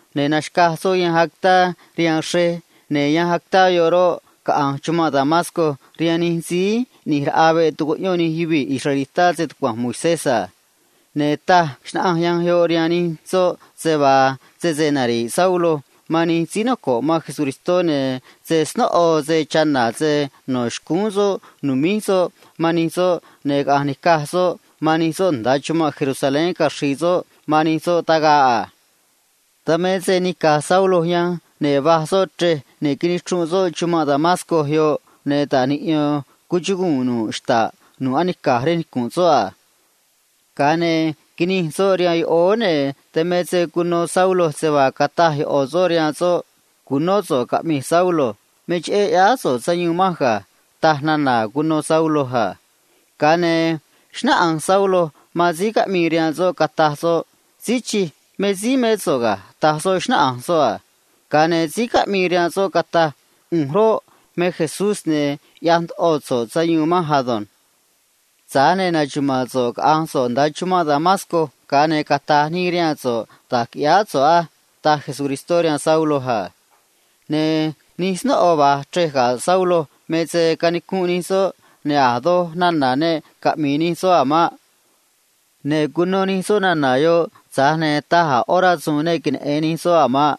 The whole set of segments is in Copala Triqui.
ne̱ naxca̱j soꞌ yanj actá rihaan xrej, ne̱ yanj actá yoꞌ roꞌ, caꞌa̱nj chumanꞌ Damasco rihaan nij síí ꞌni̱j raꞌa veꞌ tucuꞌyón nij yuvii̱ israelitá stucua̱nj Moisés a. Ne̱ taj xnaꞌanj yanj yoꞌ rihaan nij soꞌ se vaa sese nari̱ꞌ Saulo man síí noco̱ꞌ Se‑Chre̱j Jesús, ne̱ se snóꞌo se chana̱ se no̱ xcúún soꞌ nu̱míj soꞌ man nij soꞌ ne̱ caꞌa̱nj ni̱caj soꞌ man nij soꞌ nda̱a chumanꞌ Jerusalén caxri̱i̱ soꞌ man nij soꞌ tagaꞌ a. Dan me se nica̱j Saulo yanj, ne̱ va̱j soꞌ chrej, ne̱ nichrunꞌ soꞌ chumanꞌ Damasco yoꞌ, ne̱ ta̱j niꞌyo̱n cuchuguu̱n nu̱ꞌ xta̱ꞌ nu̱ꞌ anica̱j rej nicu̱nꞌ soꞌ a. Ga̱a ne̱ quinij soꞌ rihaan yoꞌóó, ne̱ dan me se cuno Saulo se vaa cataj ꞌo̱ soꞌ rihaan soꞌ a: ―Cu̱nó so̱ꞌ caꞌmi̱j, Saulo. Me cheꞌé ꞌyáá so̱ꞌ sayuun manj ga̱ ―taj nana̱ cuno Saulo a. Ga̱a ne̱ xnáꞌanj Saulo man síí caꞌmii rihaan soꞌ, cataj soꞌ a: ―Señor, me síí mé so̱ꞌ ga̱ ―taj soꞌ, xnáꞌanj soꞌ a. Ga̱a ne̱ síí caꞌmii rihaan soꞌ cataj a: ―ꞌU̱nj roꞌ, me Jesús, ne̱ ꞌyaj ndoꞌo so̱ꞌ sayuun manj ado̱nj. Tza̱j ne̱ na̱xaga̱a̱ so̱ꞌ caꞌa̱nj so̱ꞌ nda̱a chumanꞌ Damasco, ga̱a ne̱ cata̱j nii rihaan so̱ꞌ da̱j qui̱ꞌyáá so̱ꞌ á ―taj Jesús rihaan Saulo a. Ne̱ nij snóꞌo va̱j chrej ga̱ Saulo me se canicunꞌ nij soꞌ, ne̱ a̱ doj nana̱ ne caꞌmi̱i̱ nij soꞌ a̱ maꞌ. Ne̱ cuno nij soꞌ nana̱ yoꞌ, tza̱j ne̱ taj a̱ ꞌó yuvii̱ ne queneꞌe̱n nij soꞌ a̱ maꞌ.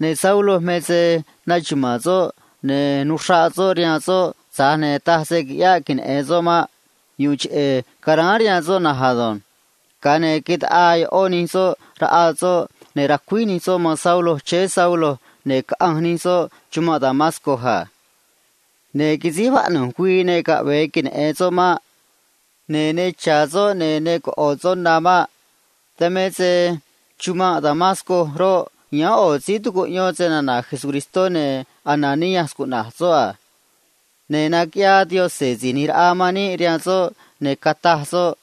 Ne̱ Saulo me se naxuma̱a̱n soꞌ, ne̱ nuxraꞌ soꞌ rihaan soꞌ, tza̱j ne̱ taj se quiꞌyáꞌ queneꞌe̱n soꞌ maꞌ. Dan ga̱a ne̱ taꞌaa ꞌó nij soꞌ raꞌa soꞌ, ne̱ racuíj nij soꞌ man Saulo chéé Saulo, ne̱ caꞌanj nij soꞌ catúj nij soꞌ chumanꞌ Damasco a. Ne̱ quisíj vaꞌnu̱j güii ne caꞌve̱e queneꞌe̱n soꞌ maꞌ. Ne̱ ne cha̱ soꞌ ne̱ ne coꞌo̱ soꞌ na a̱ maꞌ. Dan me se chumanꞌ Damasco roꞌ, yáán ꞌo̱ síí tucuꞌyón snana̱ Jesús, ne̱ Ananías cuꞌna̱j soꞌ a. Ne̱ naquiꞌyaa Jesús Si̱j ꞌNi̱j Raꞌa man níꞌ rihaan soꞌ, ne̱ cataj soꞌ a: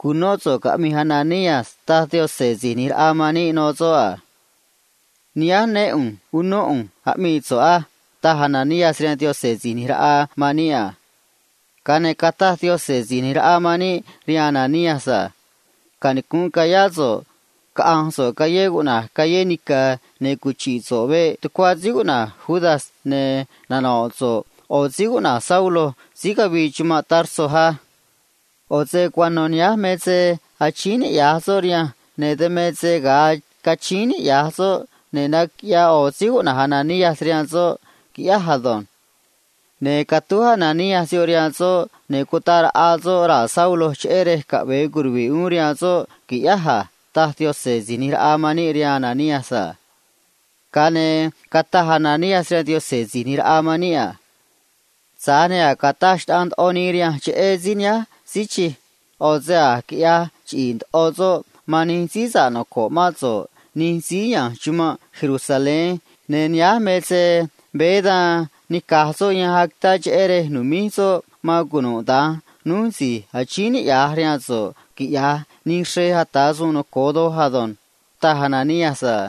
―Cu̱nó so̱ꞌ caꞌmi̱j, Ananías ―taj Síí ꞌNi̱j Raꞌa man níꞌ rihaan soꞌ a. ―Nihánj né ꞌu̱nj unó ꞌu̱nj aꞌmii so̱ꞌ á ―taj Ananías rihaan Síí ꞌNi̱j Raꞌa man níꞌ a. Ga̱a ne̱ cataj Jesús Si̱j ꞌNi̱j Raꞌa man níꞌ rihaan Ananías a: ―Canicu̱nꞌ ca̱yá so̱ꞌ caꞌa̱nj so̱ꞌ callé cuꞌna̱j Callé Nica̱, ne̱ cuchi̱ꞌ so̱ꞌ veꞌ tucuá síí cuꞌna̱j Judas, ne̱ nano̱ꞌ so̱ꞌ ꞌo̱ síí cuꞌna̱j Saulo síí cavii chumanꞌ Tarso á. ꞌO̱ se cuano̱ nihánj me se achíín niꞌya̱j soꞌ rihanj, ne̱ dan me se ga̱a cachíín niꞌya̱j soꞌ ne̱ naquiꞌyaa ꞌo̱ snóꞌo cuꞌna̱j Ananías rihaan soꞌ, quiꞌyáj ado̱nj. Ne̱ catúj Ananías yoꞌ rihaan soꞌ, ne̱ cutaꞌ raꞌa soꞌ raa̱ Saulo, cheꞌé rej caꞌve̱e curuvi̱ꞌ uún rihaan soꞌ qui̱ꞌyáj a ―taj Síí ꞌNi̱j Raꞌa man níꞌ rihaan Ananías a. Ga̱a ne̱ cataj Ananías rihaan Síí ꞌNi̱j Raꞌa man níꞌ a: ―Señor, tza̱j ne̱ a̱j cataj xnaꞌanj ndoꞌo nii rihanj cheꞌé síí nihánj a. ꞌO̱ se a̱j quiꞌyaj chiꞌi̱i̱ ndoꞌo soꞌ man nij síí noco̱ꞌ mán so̱ꞌ nij síí ya̱nj chumanꞌ Jerusalén, ne̱ nihánj me se veé da̱nj nica̱j soꞌ yanj actá cheꞌé rej nu̱míj soꞌ man cunuda̱nj núj si̱j achíín niꞌya̱j rihaan so̱ꞌ, quiꞌyaj nij xrej ata̱ suun noco̱o ado̱nj ―taj Ananías a.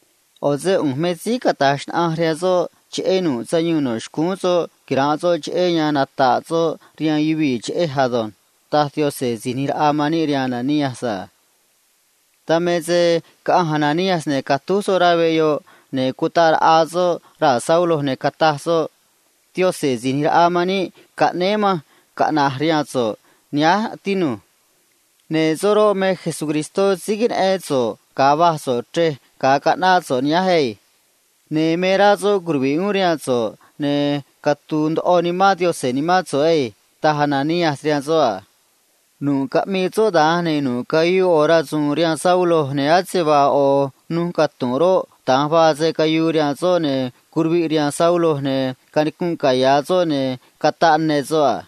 ꞌO̱ se ꞌu̱nj me síí cata̱j xnaꞌanj rihaan soꞌ cheꞌé nu̱ꞌ sayuun no̱ xcúún soꞌ quira̱nꞌ soꞌ, cheꞌé yan nata̱ꞌ soꞌ rihaan yuvii̱ cheꞌé se‑chu̱vií ꞌu̱nj ado̱nj ―taj Jesús Si̱j ꞌNi̱j Raꞌa man níꞌ rihaan Ananías a. Dan me se caꞌanj Ananías, ne̱ catúj soꞌ rá veꞌ yoꞌ, ne̱ cutaꞌ raꞌa soꞌ raa̱ Saulo, ne̱ cataj soꞌ a: ―Jesús Si̱j ꞌNi̱j Raꞌa man níꞌ caꞌnéé manj caꞌna̱j rihaan so̱ꞌ nihánj, tinu̱j. Ne̱ soꞌ roꞌ, me síí queneꞌén so̱ꞌ ga̱a va̱j so̱ꞌ chrej ga̱a caꞌnáꞌ so̱ꞌ nihánj á. Ne̱ me rá soꞌ curuvi̱ꞌ uún rihaan so̱ꞌ ne̱ cara̱a ndoꞌo Nimán Yaꞌanj nimán so̱ꞌ ado̱nj ―taj Ananías rihaan soꞌ a. Nu̱ꞌ caꞌmii soꞌ da̱nj, ne̱ nu̱ꞌ cayuu rasu̱u̱n rihaan Saulo, ne̱ ase vaa roꞌój xráá xcuaj roꞌ, da̱nj vaa se cayuu rihaan soꞌ, ne̱ curuviꞌ rihaan Saulo, ne̱ canicunꞌ caya̱ soꞌ, ne̱ cataꞌ ne soꞌ a.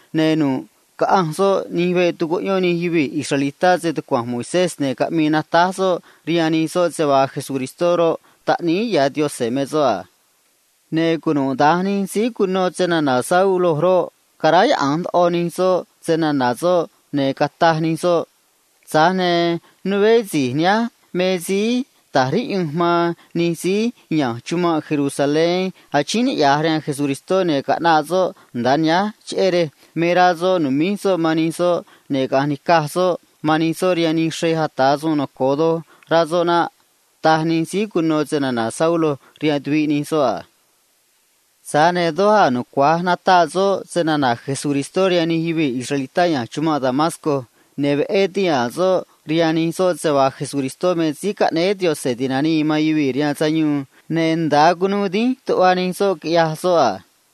Ne̱ nu̱ꞌ caꞌanj soꞌ nij veꞌ tucuꞌyón nij yuvii̱ israelitá stucua̱nj Moisés, ne̱ caꞌmii natáj soꞌ rihaan nij soꞌ se vaa Jesús roꞌ, Taꞌníí ya̱ Yaꞌanj me soꞌ a. Ne̱ cunuda̱nj nij síí cuno snana̱ Saulo roꞌ, caráyaꞌa̱nj ndoꞌo nij soꞌ snana̱ soꞌ, ne̱ cataj nij soꞌ a: ―Tza̱j ne̱ né si̱j nihánj me síí ta̱j riꞌyunj man nij síí ya̱nj chumanꞌ Jerusalén achíín niꞌya̱j rihaan Jesús, ne̱ caꞌnaꞌ soꞌ nda̱a nihánj cheꞌé rej me rá soꞌ nu̱míj soꞌ man nij soꞌ ne̱ caꞌa̱nj ni̱caj soꞌ man nij soꞌ rihaan nij xrej ata̱ suun noco̱o doj, rá soꞌ naꞌ ―taj nij síí cuno snana̱ Saulo rihaan tuviꞌ nij soꞌ a. Tza̱j ne̱ doj a̱ nucua̱j nataꞌ soꞌ snana̱ Jesús rihaan nij yuvii̱ israelitá ya̱nj chumanꞌ Damasco a. Ne̱ veꞌé tihaa̱n soꞌ rihaan nij soꞌ se vaa Jesús me Síí Caꞌnéé Yaꞌanj Ti̱nanii man Yuvii̱ rihaan Sayuun, ne̱ nda̱a cunuu dínj tuꞌva nij soꞌ, quiꞌyaj soꞌ a.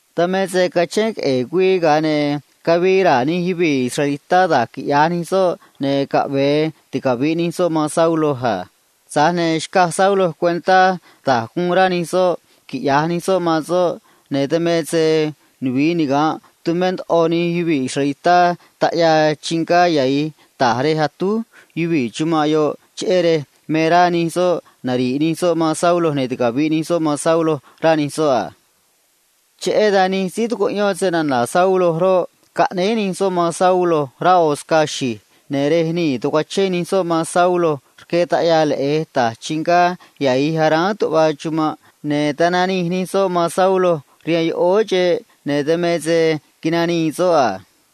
Dan me se cachén queꞌe̱e̱ güii, ga̱a ne̱ cavii raa̱ nij yuvii̱ israelitá da̱j quiꞌya̱j nij soꞌ ne̱ caꞌve̱e ticavi̱ꞌ nij soꞌ man Saulo a. Tza̱j ne̱ xcaj Saulo cuentá da̱j guun rá nij soꞌ quiꞌya̱j nij soꞌ man soꞌ a. Ne̱ dan me se nuvi̱i niga̱nꞌ tumé ndoꞌo nij yuvii̱ israelitá nij taꞌyaa chingá yahi̱j ta̱j rej atúj yuvii̱ chumanꞌ yoꞌ, cheꞌé se me rá nij soꞌ nari̱ꞌ nij soꞌ man Saulo ne̱ ticavi̱ꞌ nij soꞌ man Saulo, rá nij soꞌ a. Cheꞌé dan nij síí tucuꞌyón snana̱ Saulo roꞌ, caꞌnéé nij soꞌ man Saulo rá ꞌo̱ scaa xi̱j, ne̱ rej nii̱ tacuachén nij soꞌ man Saulo rque ꞌo̱ ventaná ta̱j rihaan chraan nicu̱nꞌ nu̱ꞌ anica̱j tuꞌva chumanꞌ, ne̱ tananij nij soꞌ man Saulo rihaan yoꞌóó xeꞌ, ne̱ dan me se nanii soꞌ a.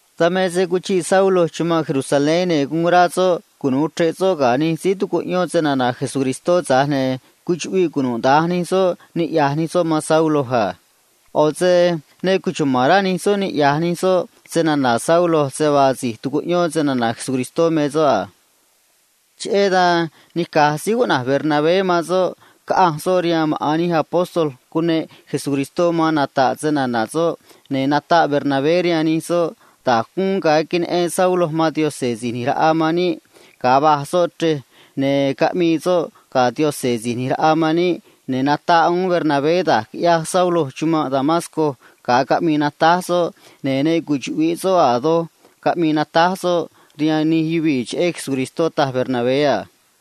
Dan me se cuchiꞌ Saulo chumanꞌ Jerusalén, ne̱ guun rá soꞌ cunu̱u chre̱ꞌ soꞌ ga̱ nij síí tucuꞌyón snana̱ Jesús, tza̱j ne̱ cuchuꞌviꞌ cunuda̱nj nij soꞌ niꞌya̱j nij soꞌ man Saulo a. ꞌO̱ se ne cuchuma̱n rá nij soꞌ snana̱ Saulo se vaa a̱j si̱j tucuꞌyón snana̱ Jesús me soꞌ a. Cheꞌé dan nica̱j síí cuꞌna̱j Bernabé man soꞌ, caꞌanj soꞌ rihaan maꞌa̱n nij síí cuneꞌ Jesús caꞌa̱nj nata̱ꞌ snana̱ soꞌ a. Ne̱ nataꞌ Bernabé rihaan nij soꞌ da̱j guun ga̱a queneꞌen Saulo man Jesús Si̱j ꞌNi̱j Raꞌa man níꞌ ga̱a va̱j soꞌ chrej ne̱ caꞌmii Saulo ga̱ soꞌ a. Ne̱ nataꞌ uún Bernabé da̱j quiꞌyaj Saulo chumanꞌ Damasco ga̱a caꞌmii natáj soꞌ, ne̱ a̱ doj ne cuchuꞌvi̱ꞌ soꞌ caꞌmi̱i̱ natáj soꞌ rihaan nij yuvii̱ cheꞌé se‑chuvi̱i Jesús, taj Bernabé a.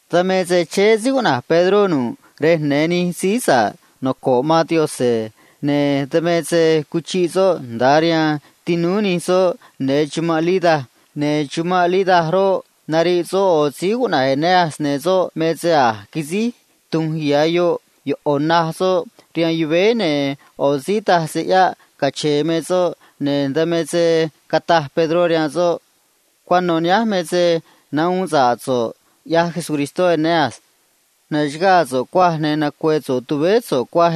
Dan me se chéé síí cuꞌna̱j Pedró nu̱ꞌ rej ya̱nj nij síí noco̱ꞌ man Jesús, ne̱ dan me se cuchiꞌ soꞌ nda̱a rihaan tinúú nij soꞌ ya̱nj chumanꞌ Lida a. Ne̱ chumanꞌ Lida roꞌ, nariꞌ soꞌ ꞌo̱ síí cuꞌna̱j Eneas, ne̱ soꞌ me se a̱j quisíj tu̱nj ya̱ yoꞌ ꞌo̱ naj soꞌ rihaan yuvéé, ne̱ ꞌo̱ síí taj se ꞌyáꞌ cache̱e̱ me soꞌ a. Dan me se cataj Pedró rihaan soꞌ a: ―Cuano̱ nihánj me se nahuun sa̱ꞌ so̱ꞌ, ꞌyaj Jesucristó, Eneas. Na̱xaga̱a̱ so̱ꞌ, ne̱ nacue̱ so̱ꞌ tuvéé so̱ꞌ na̱nj á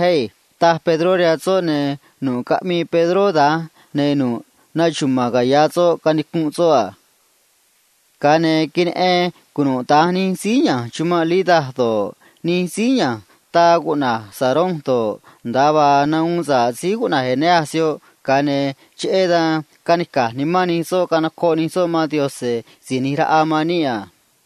―taj Pedró rihaan soꞌ a. Ne̱ nu̱ꞌ caꞌmii Pedró da̱nj, ne̱ nu̱ꞌ canicunꞌ caya̱ soꞌ a. Ga̱a ne̱ queneꞌen cunuda̱nj nij síí ya̱nj chumanꞌ Lida do̱ꞌ, nij síí ya̱nj taa cuꞌna̱j Sarón do̱ꞌ, nda̱a vaa nahuun sa̱ꞌ síí cuꞌna̱j Eneas yoꞌ, ga̱a ne̱ cheꞌé dan canica̱j nimán nij soꞌ canocoꞌ nij soꞌ man Jesús Si̱j ꞌNi̱j Raꞌa man níꞌ a.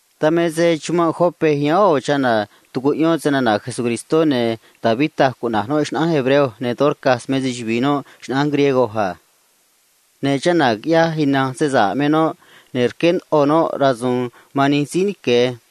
Dan me se chumanꞌ Jope yáán ꞌo̱ chana̱ tucuꞌyón snana̱ Jesús, ne̱ Tabita cuꞌna̱j noꞌ xnaꞌánj hebreo, ne̱ Dorcas me se‑chuvi̱i noꞌ xnaꞌánj griego a. Ne̱ chana̱ quiꞌyaj ina̱nj se sa̱ꞌ me noꞌ, ne̱ rqué ndoꞌo noꞌ rasu̱u̱n man nij síí nique̱ a.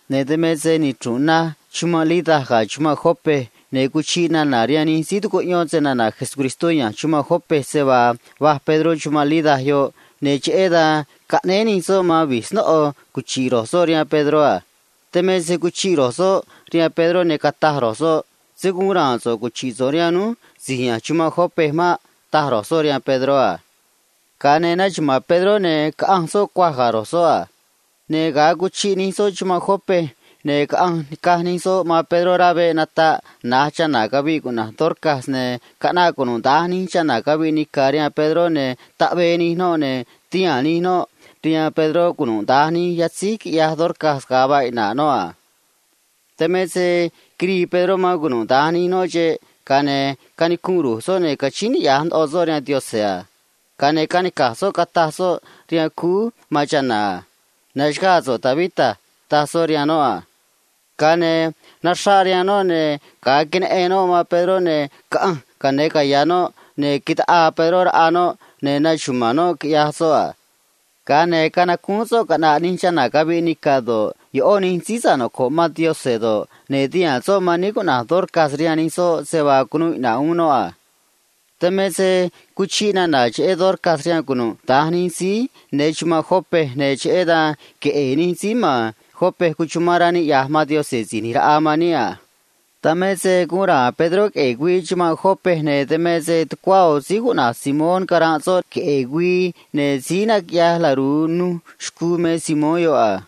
Ne̱ dan me se nichru̱nꞌ na̱j chumanꞌ Lida ga̱ chumanꞌ Jope, ne̱ cuchiꞌ nana̱ rihaan nij síí tucuꞌyón snana̱ Jesús ya̱nj chumanꞌ Jope se vaa va̱j Pedró chumanꞌ Lida yoꞌ, ne̱ cheꞌé dan caꞌnéé nij soꞌ man vi̱j snóꞌo cuchi̱ꞌ ro̱j soꞌ rihaan Pedró a. Dan me se cuchiꞌ ro̱j soꞌ rihaan Pedró, ne̱ rquee̱ ro̱j soꞌ rihaan soꞌ a: ―Se̱ guun ra̱a̱n so̱ꞌ cuchi̱ꞌ so̱ꞌ rihaan núj si̱j ya̱nj chumanꞌ Jope maꞌ ―taj ro̱j soꞌ rihaan Pedró a. Ga̱a ne̱ naxuma̱a̱n Pedró, ne̱ caꞌanj soꞌ cuaj ga̱ ro̱j soꞌ a. Ne̱ ga̱a cuchiꞌ nij soꞌ chumanꞌ Jope, ne̱ caꞌanj nica̱j nij soꞌ man Pedró rá veꞌ nataꞌ na̱j chana̱ caviꞌ cuꞌna̱j Dorcas a. Ne̱ caꞌnaꞌ cunuda̱nj nij chana̱ caviꞌ nica̱ rihaan Pedró, ne̱ taꞌvee nij noꞌ, ne̱ tihaa̱n nij chana̱ rihaan Pedró cunuda̱nj nij yatzíj quiꞌyaj Dorcas ga̱a vaa iꞌna̱ꞌ noꞌ a. Dan me se quirii Pedró man cunuda̱nj nij noꞌ xeꞌ, ga̱a ne̱ canicunꞌ ru̱j soꞌ, ne̱ cachíín niꞌya̱j ndoꞌo soꞌ rihaan Yaꞌanj a. Ga̱a ne̱ canica̱j soꞌ, cataj soꞌ rihaan cúú man chana̱ a: ―Na̱xaga̱a̱ so̱ꞌ, Tabita ―taj soꞌ rihaan noꞌ a. Ga̱a ne̱ naxraꞌ rihaan noꞌ, ne̱ ga̱a queneꞌen noꞌ man Pedró, ne̱ caꞌanj ca̱yáán caya̱ noꞌ, ne̱ taꞌaa Pedró raꞌa noꞌ, ne̱ naxuma̱a̱n noꞌ, quiꞌyaj soꞌ a. Ga̱a ne̱ canacúún soꞌ caꞌna̱ꞌ nij chana̱ caviꞌ nica̱ do̱ꞌ, ꞌó nij síí noco̱ꞌ man Jesús do̱ꞌ, ne̱ tihaa̱n soꞌ man níí cuꞌna̱j Dorcas rihaan nij soꞌ se vaa cunuu iꞌna̱ꞌ uún noꞌ a. Dan me se cuchiꞌ nana̱ cheꞌé Dorcas rihaan cunuda̱nj nij síí ya̱nj chumanꞌ Jope, ne̱ cheꞌé dan queꞌe̱e̱ nij síí ma̱n Jope cuchumán rá niꞌya̱j man Jesús Si̱j ꞌNi̱j Raꞌa man níꞌ a. Dan me se guun ra̱a̱n Pedró queꞌe̱e̱ güii chumanꞌ Jope, ne̱ caranꞌ soꞌ tucuá ꞌo̱ síí cuꞌna̱j Simón, síí naquiꞌyaj laru̱u nuj xcuu a.